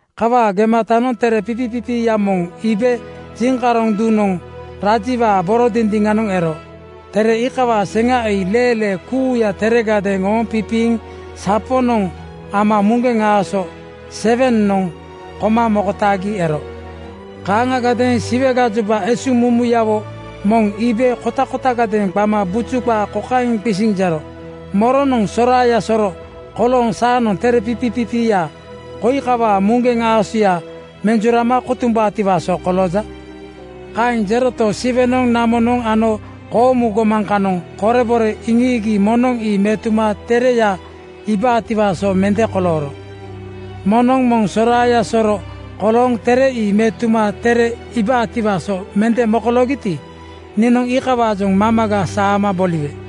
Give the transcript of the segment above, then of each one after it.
Kawaa gematanoŋ tere pipipipiiya moŋ iibe jiŋkaroŋ duŋnoŋ rajiwaa boro dindiŋanoŋ ero. Tere iikawaa seŋa ii leelee kuuya teregadeeŋ ooŋ pipiiŋ saponoŋ ama muŋgeŋ aaso (siil) 7:noŋ koma mokotaagita ero. Kaaŋagadeeŋ Siwe gajoba esuŋmumuyawo moŋ iibe kotakotagadeeŋ qama buju qaa kokaeŋ qisiŋ jero, “Moronoŋ soraaya soro kolooŋ saanoŋ tere pipipipiiya koi kawaa muŋgeŋ aasoya (siil) menjurama kotumbaatiwaa so kolooja?” Kaeŋ jeroto, Siwenoŋ, namonoŋ ano koomu gomaŋ kanoŋ korebore iŋiigi moŋnoŋ ii metuma tereya iibaatiwaa so mende kolooro. Moŋnoŋ moŋ soraaya soro kolooŋ tere ii metuma tereya iibaatiwaa so mende mokoloogiti, niinoŋ iikawaajoŋ mamaga saama boliwe.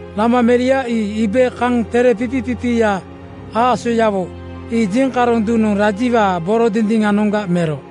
Lama meria ii iibe kaŋ tere pipipipiiya aasoyawo ii jiŋkaroŋ duŋnoŋ rajiwaa boro dindiŋanoŋga mero.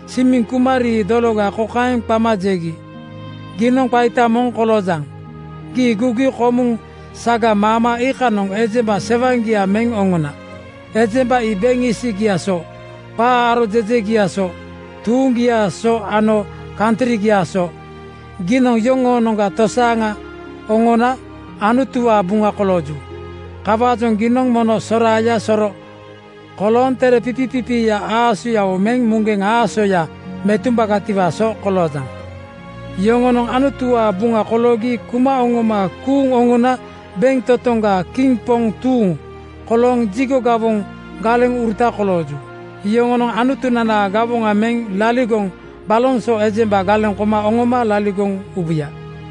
Simiŋ kuma rii dologa kokaeŋ qama jegi, “Giinoŋ qaita moŋ koloojaŋ. Gii gugi komuŋ saga maama iikanoŋ ejemba sewaŋgia meŋ oŋona. Ejemba ii beŋ isigiaa so, qaa aro jejegiaa so, tuuŋgiaa so ano kantrigiaa so. Giinoŋ yoŋoonoŋga tosaaŋa oŋona Anutuwaa buŋa kolooju. Kawaajoŋ giinoŋ mono soraaya soro kolooŋ tere pipipipiiya aasoyawo meŋ muŋgeŋ aasoya (siil) metumbagatiwaa so koloojaŋ. Yoŋonoŋ Anutuwaa buŋa koloogi kuma oŋoma kuuŋ oŋona beŋtotoŋgaa kiŋ poŋ tuuŋ kolooŋ jigo gawoŋ galeŋuruta kolooju. Yoŋonoŋ Anutunanaa gawoŋa meŋ laligoŋ baloŋ so ejemba galeŋ koma oŋoma laligoŋ ubuya.”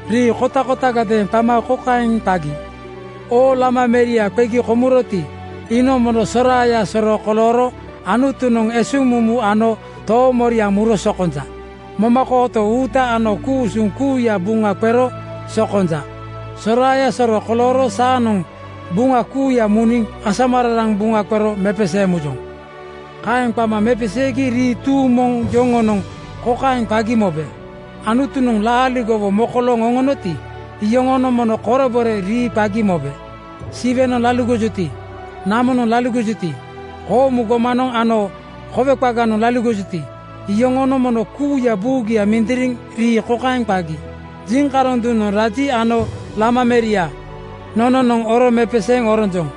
Rii kotakotagadeeŋ qama kokaeŋ qagi, “Oo Lama meria qegi komuroti, iinoŋ mono soraaya soro kolooro Anutunoŋ esuŋmumu ano toomoriaŋ muro sokonja. Momakooto uuta ano ku-usuŋ kuuya buŋa qero sokonja. Soraaya soro kolooro saanoŋ qabuŋa kuuya muniŋ asamararaŋ buŋa qero mepeseeŋ mujoŋ.” Kaeŋ qama mepeseegi rii tuuŋ moŋ yoŋonoŋ kokaeŋ qagi mobe: Anutunoŋ laaligowo mokolooŋ oŋonoti, iyoŋonoŋ mono korebore rii qagi mobe. Siwenoŋ laligojuti, namonoŋ laligojuti, koomu gomanoŋ ano kowe qaganoŋ laligojuti, iyoŋonoŋ mono kuuya buugia mindiriŋ rii kokaeŋ qagi, “Jiŋkaroŋ duŋanoŋ raji ano Lama meria nononoŋ oro mepeseeŋ oronjoŋ.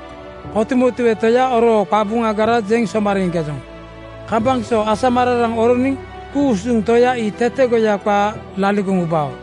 Kotumotue Toya oroo qabuŋagara jeŋ somariiŋkejoŋ. Kambaŋ so asamararaŋ oroniŋ ku-usuŋ Toya ii tetegoya qaa laligoŋ ubao.”